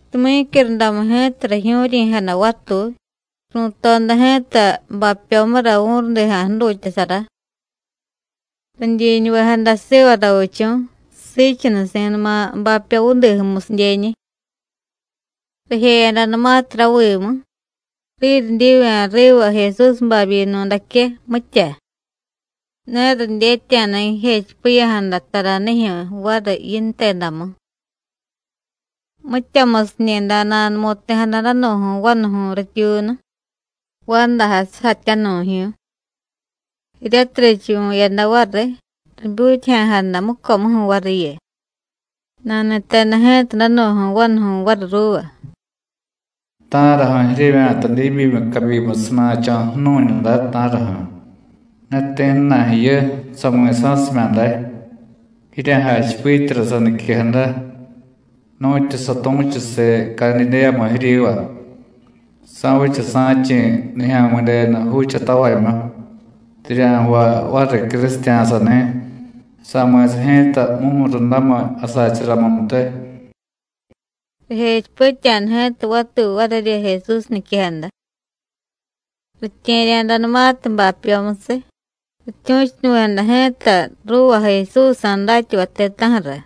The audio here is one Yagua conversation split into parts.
Tumyícyurundamu ji̱ta, rijyu̱ryi̱jada vatuy, ru̱toda ji̱ta bapyomura vu̱rudija̱ jdutyasara. Ridyiñuvejada siva ravichu̱ siichunusi̱numa bapyo vudiju̱musidyeñi̱. Rijeyadanumatiy ravimu, riryidyivya̱ riva Jesús babyinu̱daque, mitya. Ne ridyetya̱da jijechipiya̱jada taranijyu̱ variy yintedamu. Mityamusiñi̱day nanumu̱ti̱jada danu̱ju̱y vanuju̱y rityuunu, vandajay sujatyanu̱jyu̱y. Jiryatiy richuvu̱yada variy, ribyutyaja̱jada mucomuju̱ variyu. Nani̱teda ji̱ta danu̱ju̱y vanuju̱y variy ruuva: “¿Ta̱raju̱ jiryevya̱ta diibyimiy cabyimu sana̱cho̱ ju̱nu̱ñu day, ta̱raju̱? Ne ti̱jna̱y jiyu, sami̱sa̱simya̱ day. Jirya̱jachipityara saniquejada, nu̱tyu satu̱chusiy Cadidéyamu jiryiva: Sa̱vicha sa̱chi̱ Nijya̱mi̱denu juuchatavamyu, rirya̱jvay variy crusitya̱sani̱, sa̱mi̱sa ji̱ta mumurundamiy jasacharamuntiy.” Rijechipitya̱da ji̱ta vatuy varirya Jesús niquejada. Ritye̱rya̱danumatiy bapyomusiy, rityu̱chunuvi̱jada ji̱ta ruuva Jesúsjsa̱ datyavay ti̱ta̱ju̱ra,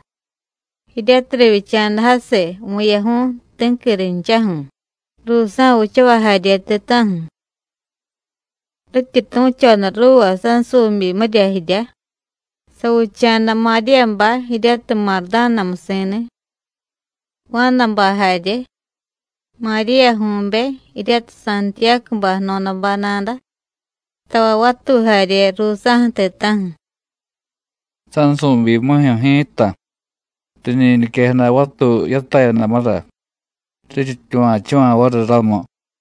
jiryatiy rivyicha̱da jasiy vu̱yaju̱y, ti̱qui rinchaju̱, ruusa̱ vichavay jarye ti̱ta̱ju̱. Rityi tu̱choda ruuva sansu̱byimirya jiryá, savicha̱da Maríyabay jiryatiy Mardánamusi̱ni̱, Juánabay jarye, Maríyaju̱be jiryatiy Santiyácubay jno̱dabay nada, tavay vatuy jarye ruusa̱ju̱ ti̱ta̱ju̱. Sansu̱byimijyu̱ ji̱ta, riñi niquejada vatuy yatayadamura, riryityuva̱chuva̱ variy ramu.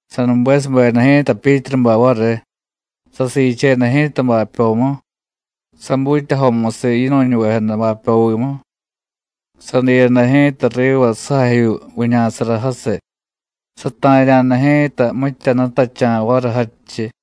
Sanubesubeda ji̱ta Pyítrubay variy, sasiicheda ji̱ta bapyomu, sabutyajomusiy yinu̱ñuvejada bapyovimu, sadiyada ji̱ta riva sujajyuu viña̱sara jasiy, sata̱rya̱da ji̱ta mitya jnutacha̱ variy jadchiy.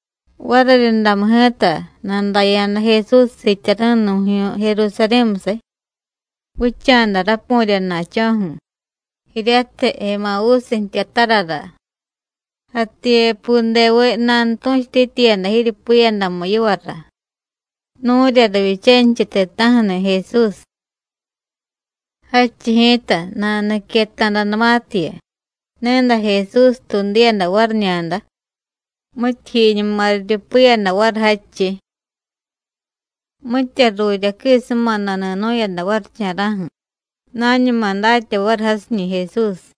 Variryundamu ji̱ta, nadaya̱da Jesús siityari̱nu̱jyu̱y Jerusarí̱musiy, vicha̱da rapu̱rya na̱cho̱ju̱, jiryatiy Emavúsiy jtyatarara. Jativyepudeviy nanutu̱chutityiyada jiryupiyadamu yivara, nu̱rya rivyichanichiy ti̱ta̱ju̱ni̱ Jesús. Jadchiy ji̱ta, nanuniqueta̱danumatiyu, ni̱day Jesús tuudiyada variñada, mityijyiñuma riryupiyada variy jadchiy. Mitya jruryaquisuma nani̱nu̱yada varicha̱ra̱ju̱, nañuma datya variy jasiñi̱ Jesús.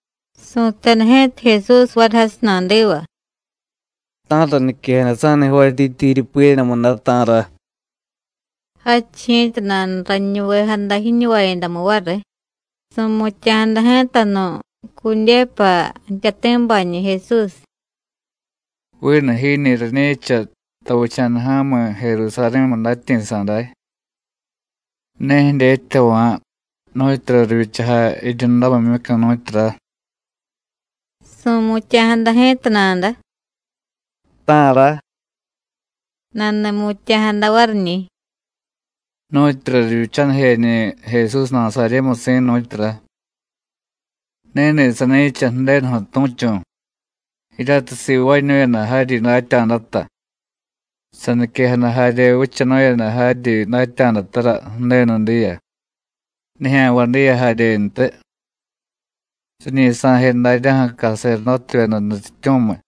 Su̱teda ji̱ta Jesús variy jasiy nadiva: “¿Ta̱ra niquejada sa̱ni jvaatyityi jiryupiyadamu day, ta̱ra?” Jadchiy ji̱ta, nanuraniñuvejada jiñuvayadamu variy. Su̱mutya̱jada ji̱ta nu̱, Cudéyupa jtyati̱bañi̱ Jesús: “¿Vinu jiñi̱ rañi̱cha tavicha̱da ja̱mi̱ Jerusarí̱mu datyi̱sa̱ day? ¿Ne jidyetyava̱ nu̱tyura rivyichajay jiryundamimyucu̱, nu̱tyura?” Su̱mutya̱jada ji̱ta nada: “¿Ta̱ra?” Nani̱mutya̱jada variñi̱: “Nu̱tyura rivyichanijeñi̱ Jesús Nasaryémusi̱, nu̱tyura. Ni̱ni̱ sani̱cha Ju̱denuju̱ tu̱chu̱, jiryatiy sivaañu̱yada jaryi datya̱data, saniquejada jarye vichanu̱yada jaryi datya̱datara Ju̱denu diya, nijya̱nvay diya jaryentiy. Riñi sa̱je daryaju̱ caserdótevyeda nutyityu̱miy,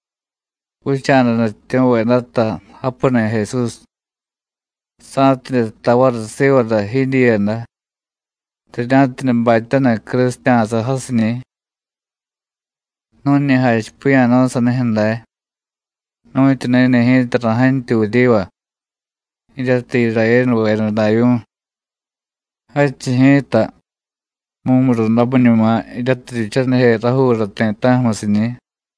vicha̱da nutyityu̱vedata japuni̱ Jesús, sa̱tidye jtay variy sivara jidyiiyada, rirya̱tidye batyaniy crusitya̱sa jasiñi̱. Nu̱ñi jachipiya̱nu̱y sanijyu̱ day, nu̱tyu ni̱ni̱ ji̱ta ra̱jantyuy vuryiva, jiryatiy Irayénuveda davyu̱y. Jadchiy ji̱ta, mumurundamiñuma jiryatiy rivyichanije rajuura ti̱ta̱ju̱musiñi̱.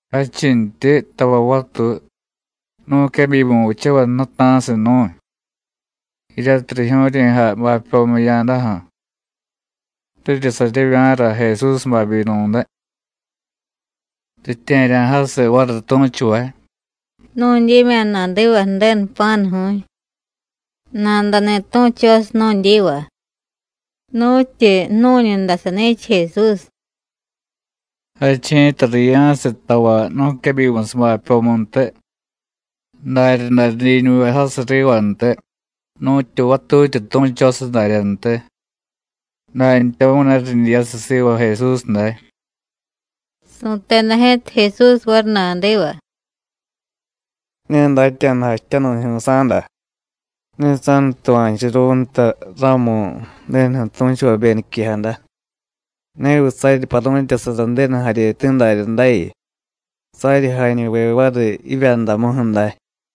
Jadchintyi, tavay vatuy, nu̱quebyimu vichavay jnuta̱siy nu̱y, jiryatiy rijyu̱ryi̱jay bapyomu jiya̱daju̱, riryi saryevya̱ra Jesús babyinu̱day. Ritye̱rya̱jasiy variy tu̱chuvay: Nu̱dyimya̱ nadiva Ju̱denu jpa̱nu̱ju̱y, nadani̱ tu̱chosiy nu̱dyiva: Nu̱tyi jnu̱ñu day sani̱cha Jesús. Jadchiy ji̱ta riya̱siy tavay nu̱quebyimusiy bapyomuntiy, daryaday ridyiñuvejasiy rivantiy, nu̱tyu vatutyi tu̱chosiy daryantiy. Dantyamu̱y ne ridyiyasiy siva Jesús day.” Su̱teda ji̱ta Jesús variy nadiva: “Ne datya̱da jachityanu̱jyu̱y sa̱da. Ne sa̱nutuva̱churu̱y nta ramu Ju̱denuju̱ tu̱chuvabe niquejada. ¿Neviy saryi paru̱tyasara Ju̱denu jaryeti̱ daryadayu, saryi jañuve variy jivyandamuju̱ day?”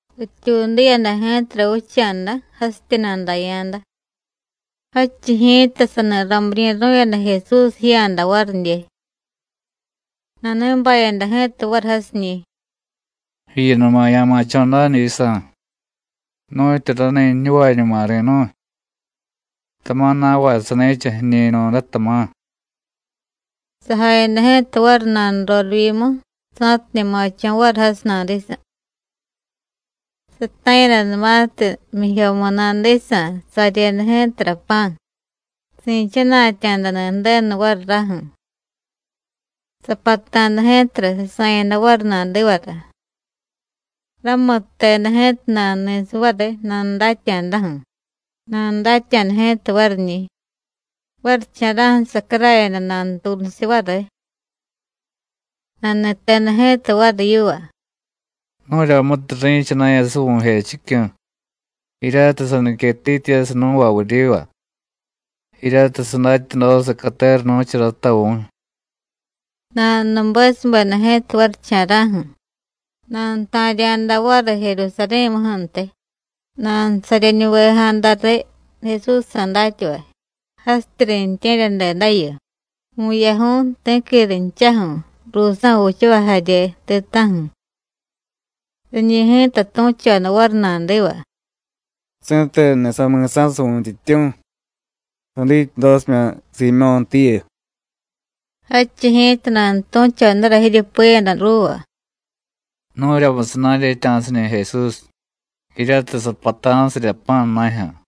Rityuudiyada ji̱tara vicha̱da jasityi nadaya̱da, jadchiy ji̱ta sani ramiryi̱ru̱yada Jesús jiya̱da varidye. Nani̱bayada ji̱ta variy jasiñi̱: “Jiyunuma ya̱ma̱cho̱ na̱dyisa̱, nu̱tyu rani ji̱ñuvañuma ri̱nu̱y, tama̱ na̱vay sani̱cha jiñi̱ nu̱day, tama̱.” Sajayada ji̱ta variy nanurorivyimu sa̱tidye ma̱cho̱ variy jasiy nadisa̱. Sata̱yadanumatiy jmyijyomu nadisa̱, saryeda ji̱tara pa̱, si̱chana̱tya̱dani̱ Ju̱denu variy raju̱. Sapata̱da ji̱tara, sasa̱yada variy nadivara. Ramutteda ji̱ta nanuni̱siy variy nanudatya̱daju̱, nanudatya̱da ji̱ta variñi̱. Varicha̱ra̱ju̱ sacarayada nanutuunusiy variy. Nani̱teda ji̱ta variy yiva: “¡Nu̱ryamutiy ri̱chana̱yasiy vu̱jechicyu̱, jiryatiy saniquetityiyasiy nú̱va vuryiva, jiryatiy sadatyadosiy catera nu̱charata vu̱y!” Nanunubesubeda ji̱ta varicha̱ra̱ju̱, nanuta̱rya̱da variy Jerusarí̱muju̱ntiy, nanusaryeñuvejada riy Jesúsjsa̱ datyavay, jasityi riintye̱ryadedayu, vu̱yaju̱y, ti̱qui rinchaju̱, ruusa̱ vichavay jarye ti̱ta̱ju̱. Riñi̱ ji̱ta tu̱choda variy nadiva: “¡Si̱tenuni̱ sami̱sa̱siy Vu̱ntyityu̱, sadityadosimya̱ Siimyó̱ntiyu!” Jadchiy ji̱ta nanutu̱chodara jiryupiyada ruuva: “Nu̱ryamusiy na̱dyetya̱siñi̱ Jesús, jiryatiy sapata̱sirya pa̱ na̱jyu̱.”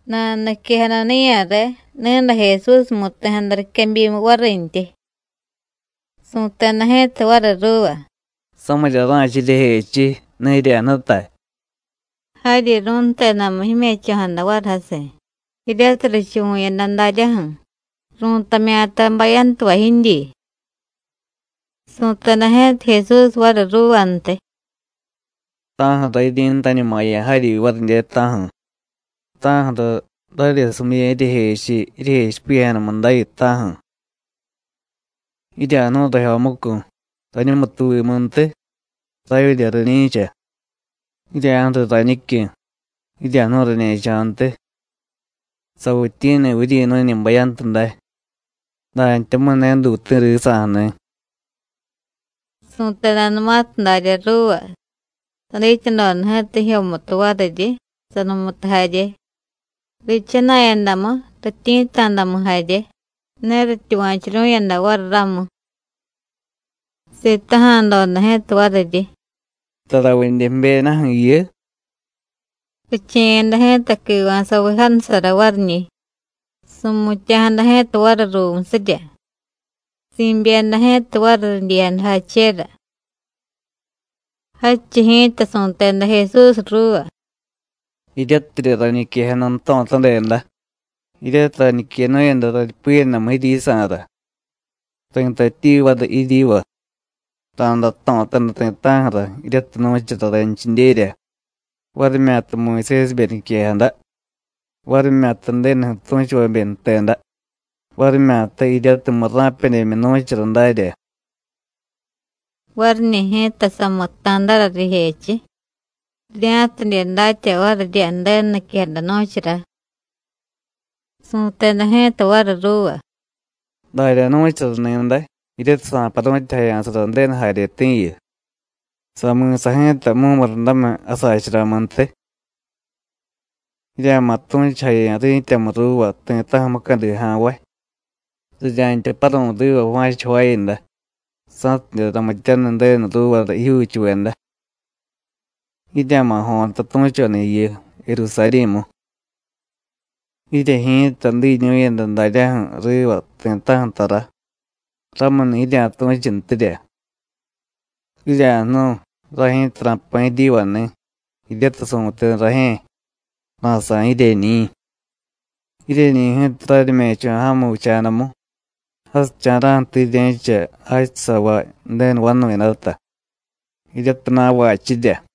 Nanuniquejada niya̱re, ni̱day Jesús mu̱ti̱jada riquebyimu varintyi. Su̱teda ji̱ta variy ruuva: “Samirya ra̱cha jiryejechiy, ne jirya̱jnutay.” Jaryi ru̱ntedamu jime̱cho̱jada variy jasiy, jiryatiy richuvu̱yada daryaju̱, ru̱tamya̱ta bayantuva jidyi. Su̱teda ji̱ta Jesús variy ruuvantiy: “¿Ta̱ju̱ra jiryi̱ntañumaya̱ jaryi varidye, ta̱ju̱? ¿Ta̱ju̱ra raryesumiya̱ jiryejechiy jiryejechipiya̱jadamu dayu, ta̱ju̱? Jirya̱jnu̱y rajyomucu̱, rañumutuvimuntiy, ravyidye rañi̱cha. Jirya̱ju̱riy rañicyu̱, jirya̱jnu̱y rañe̱cho̱ntiy; ¿savityi̱ni̱viy jiryi̱nu̱ñi̱ bayantu day? dantyamu̱y ne duuti̱ risa̱ju̱ni̱.” Su̱tedanumatiy darya ruuva, sadityadoda ji̱ta jijyomutu variryi, sanumutu jarye. Riichana̱yadamu, rityi̱tta̱damu jarye, ne rityuva̱churu̱yada variy ramu. Sitaja̱doda ji̱ta variryi: “¿Taravidye jbyedaju̱ jiyu?” Riche̱yada ji̱ta quiva̱saviy jansara variñi̱. Su̱mutya̱jada ji̱ta variy ruumusirya, si̱byeda ji̱ta variy ridyiyadajachera. Jadchiy ji̱ta su̱teda Jesús ruuva: “Jiryatirya rañiquejada jto̱tadeda, jiryatiy rañiquenu̱yada raryupiyadamu jiryisa̱ra. Ri̱tatyi variy jiryiva: Ra̱day jto̱taniy ti̱ta̱ju̱ra jiryatiy nu̱chara ranchidyerya, varimyata Muyusésibe niquejada, varimyata Ju̱denuju̱ tu̱chuvabe jteda, varimyata jiryatiy murra̱pedyemyu nu̱chara darya.” Variñi̱ ji̱ta samutta̱dara rijechiy rirya̱tidye datya varirya Ju̱denu niquejada nu̱chara. Su̱teda ji̱ta variy ruuva: “Darya nu̱chara ni̱day, jiryatiy sa̱paru̱tyasara Ju̱denu jaryeti̱yu, sa̱mi̱sa ji̱ta mumurundamiy jasacharamuntiy. Jirya̱ma̱ tu̱chujaya̱ ri̱tyamu ruuva ti̱ta̱ju̱ mucadi ja̱nvay: rirya̱ntya paru̱y riva va̱cha jvaayada, sa̱tidye ramityaniy Ju̱denu ruuvara jijyuuchuveda. Jirya̱ma̱ jo̱ta tu̱choda jiyu, Jerusarí̱mu. Jirye ji̱ta diñu̱yada daryaju̱ riva ti̱ta̱ju̱ tara, ramuni̱ jirya̱tu̱chuntirya. Jirya̱jnu̱y, ray ji̱ta ra̱jpa̱ jiryivani̱ jiryatiy su̱teda rajye̱: Ra̱sa̱y jiryeñi̱. Jiryeñi̱ ji̱ta raryime̱cho̱ ja̱mu vicha̱damu jasicha̱ra̱ju̱tiy jirye̱cha jachusavay Ju̱denu vanu̱yadata, jiryatiy na̱vachirya.”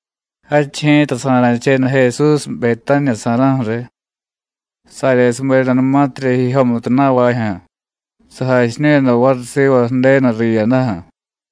Jadchiy ji̱ta sa̱ra̱cheda Jesús Betániya sa̱ra̱ju̱ riy, saryesubedanumatirya jijyomutu na̱vajyu̱, sajachiñu̱yada variy siva Ju̱denu riyadaju̱.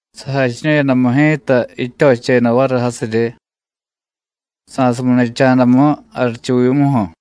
Sajachiñu̱yadamu ji̱ta jityocheda variy jasiryi, sa̱suminicha̱damu jarichuvimuju̱.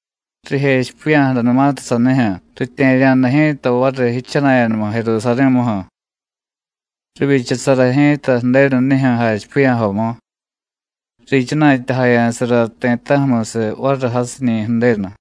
Rijechipiya̱jadanumatiy sanijyu̱, ritye̱rya̱da ji̱ta variy yichana̱yadamu Jerusarí̱muju̱. Rivyichasara ji̱ta Ju̱denu nijyu̱ jachipiya̱jomu, riichana̱tyajaya̱sara ti̱ta̱ju̱musiy variy jasiñi̱ Ju̱denu.